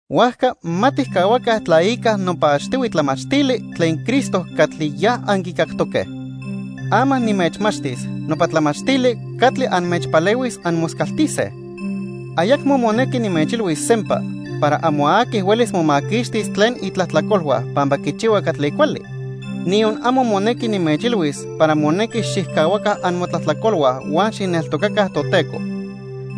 Huajca ma tijcahuaca tlaica nopa achtihui tlamachtili tlen Cristo catli ya anquicactoque. Ama nimechmachtis nopa tlamachtili catli anmechpalehuis anmoscaltise. Ayacmo monequi nimechilhuis sempa para amo aqui huelis momaquixtis tlen itlajtlacolhua pampa quichihua catli cuali, niyon amo monequi nimechilhuis para monequi xijcahuaca amotlajtlacolhua huan xijneltocaca Toteco.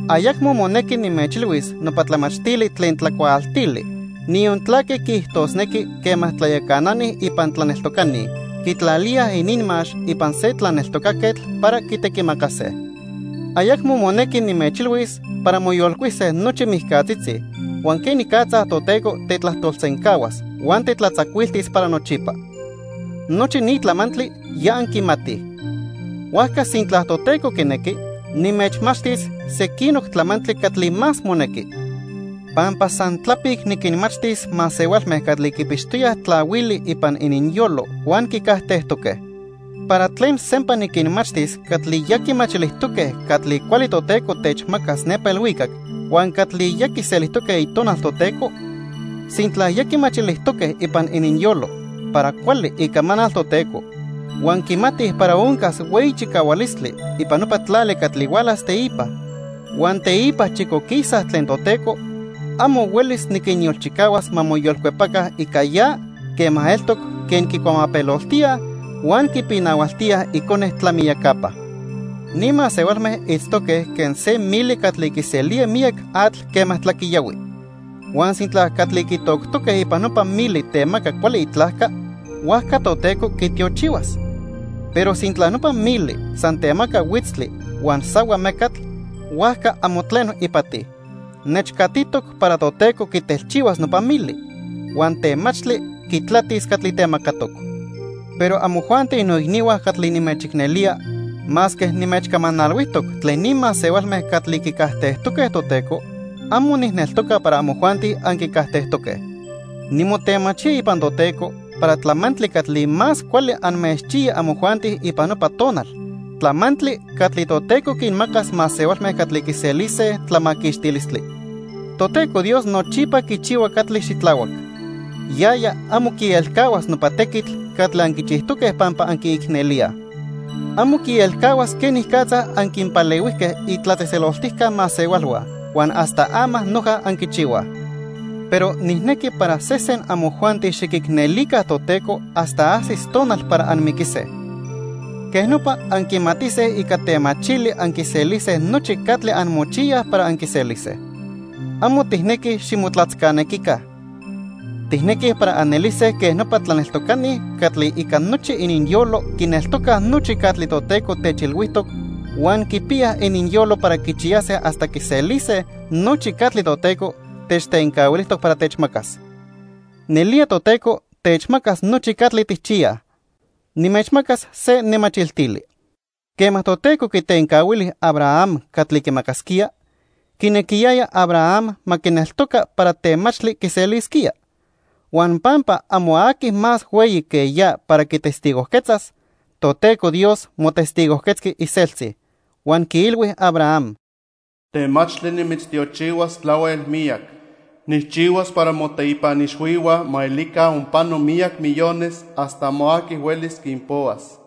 Ayacmo monequi nimechilhuis nopa tlamachtili tlen tlacuaaltili, niyon tlaque quiijtosnequi quema tlayacanani ipan tlaneltocani quitlalíaj ininmax ipan se tlaneltocaquetl para quitequimacase. Ayacmo monequi nimechilhuis para moyolcuise nochi mijcatzitzi huan quenicatza Toteco tetlajtolsencahuas huan tetlatzacuiltis para nochipa. Nochi ni tlamantli ya anquimatij. Huajca sintla Toteco quinequi, nimechmachtis sequinoc tlamantli catli más monequi. Pampa san tlapic niquinmachtis masehualme catli quipixtoyaj tlahuili ipan ininyolo huan quicajtejtoque. ¿Para tlen sempa niquinmachtis catli ya quimachilijtoque catli cuali Toteco techmacas nepa ilhuicac huan catli ya quiselijtoque Itonal Toteco? Sintla ya quimachilijtoque ipan ininyolo para cuali icamanal Toteco, huan quimatij para oncas hueyi chicahualistli ipan nopa tlali catli hualas teipa, huan teipa chicoquisaj tlen Toteco, amo huelis niquinyolchicahuas ma moyolcuepaca ica ya quema eltoc quen quicuamapeloltíaj huan quipinahualtíaj Icone tlamiyacapa. Ni masehualme itztoque quen se mili catli quiselía miyac atl quema tlaquiyahui. Huan sintla catli quitoctoque ipan nopa mili temaca cuali itlajca, huajca Toteco quitiochihuas. Pero sintla nopa mili san temaca huitztli huan sahua mecatl, huajca amo tleno ipati. Nechcatitoc para Toteco quitelchihuas nopa mili. Huan temachtli quitlatis catli temacatoc. Pero amojuanti noicnihua catli nimechicnelía, masque nimechcamanalhuijtoc tlen ni masehualme catli quicajtejtoque Toteco, amo nijneltoca para amojuanti anquicajtejtoque. Nimotemachía ipan Toteco para tlamantli catli más cuali anmechchiya amojuanti ipan nopa tonal, tlamantli catli Toteco quinmacas masehualme catli quiselise tlamaquixtilistli. Toteco Dios nochipa quichihua catli xitlahuac. Yaya amo quielcahuas nopa tequitl catli anquichijtoque pampa anquiicnelíaj. Amo quielcahuas quenicatza anquinpalehuijque itlatzejtzeloltijca masehualhua huan hasta ama noja anquichihuaj. Pero nijnequi para sesen amojuanti xiquicnelica Toteco hasta ajsis tonal para anmiquise. Quej nopa anquimatise ica temachili anquiselise nochi catli anmochiyaj para anquiselise. Amo tijnequij ximotlatzcanequica. Tijnequij para anelise quen nopa tlaneltocani catli ica nochi ininyolo quineltocaj nochi catli Toteco techilhuijtoc huan quipiyaj ininyolo para quichiyase hasta quiselise nochi catli Toteco techtencahuilijtoc para techmacas. Nelía Toteco techmacas nochi catli tijchiyaj Nimechmacas se nemachiltili. Quema Toteco quitencahuili Abraham catli quimacasquía, quinequiyaya Abraham ma quineltoca para temachtli quiselisquía. Huan pampa amo aqui más hueyi que ya para quitestigojquetzas, Toteco Dios motestigojquetzqui iseltzi, huan quiilhui Abraham: "Temachtli nimitztiochihuas tlahuel miyac. Nijchihuas para moteipan ixhuihua ma elica onpano miyac millones hasta amo aqui huelis quinpohuas."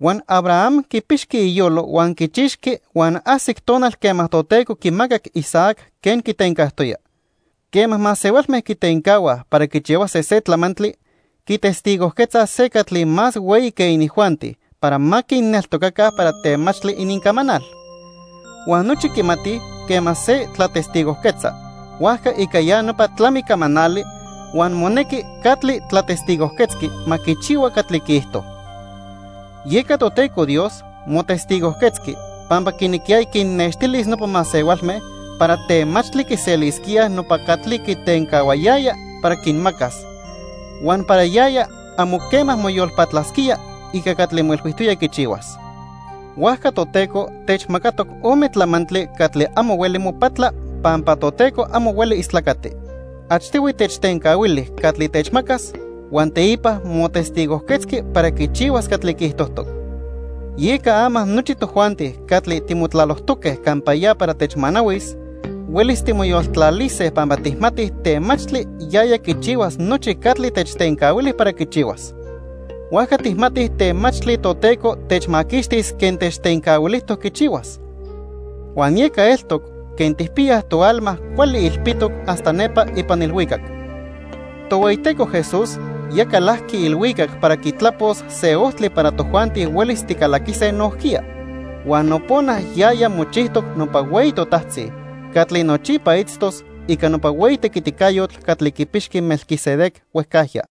Huan Abraham quipixqui iyolo huan quichixqui huan ajsic tonal quema Toteco quimacac Isaac quen quitencajtoya. Quema masehualme quitencahuaj para quichihuase se tlamantli, quitestigojquetzaj se catli más hueyi que inijuanti para ma quinneltocaca para temachtli inincamanal. Huan nochi quimatij quema se tlatestigojquetza huajca ica ya nopa tlami camanali huan monequi catli tlatestigojquetzqui ma quichihua catli quiijto. Yeca Toteco Dios motestigojquetzqui pampa quinequiyaya quinnextilis nopa masehualme para temachtli quiselisquíaj nopa catli quitencahuayaya para quinmacas, huan para yaya amo quema moyolpatlasquía ica catli moilhuijtoya quichihuas. Huajca Toteco techmacatoc ome tlamantli catli amo hueli mopatla, pampa Toteco amo hueli istlacati. Achtihui techtencahuili catli techmacas huan teipa motestigojquetzqui para quichihuas catli quiijtojtoc. Yeca ama nochi tojuanti catli timotlalojtoque campa ya para techmanahuis, huelis timoyoltlalise pampa tijmatij temachtli yaya quichihuas nochi catli techtencahuili para quichihuas. Huajca tijmatij temachtli Toteco techmaquixtis quen techtencahuilijtoc quichihuas. Huan yeca eltoc quen tijpiyaj toalma cuali ilpitoc hasta nepa ipan ilhuicac. Tohueyiteco Jesús ya calajqui ilhuicac para quitlapos se ojtli para tojuanti huelis ticalaquise nojquiya. Huan nopona yaya mochijtoc nopa hueyi totajtzi catli nochipa itztos ica nopa hueyi tequiticayotl catli quipixqui Melquisedec huejcajya.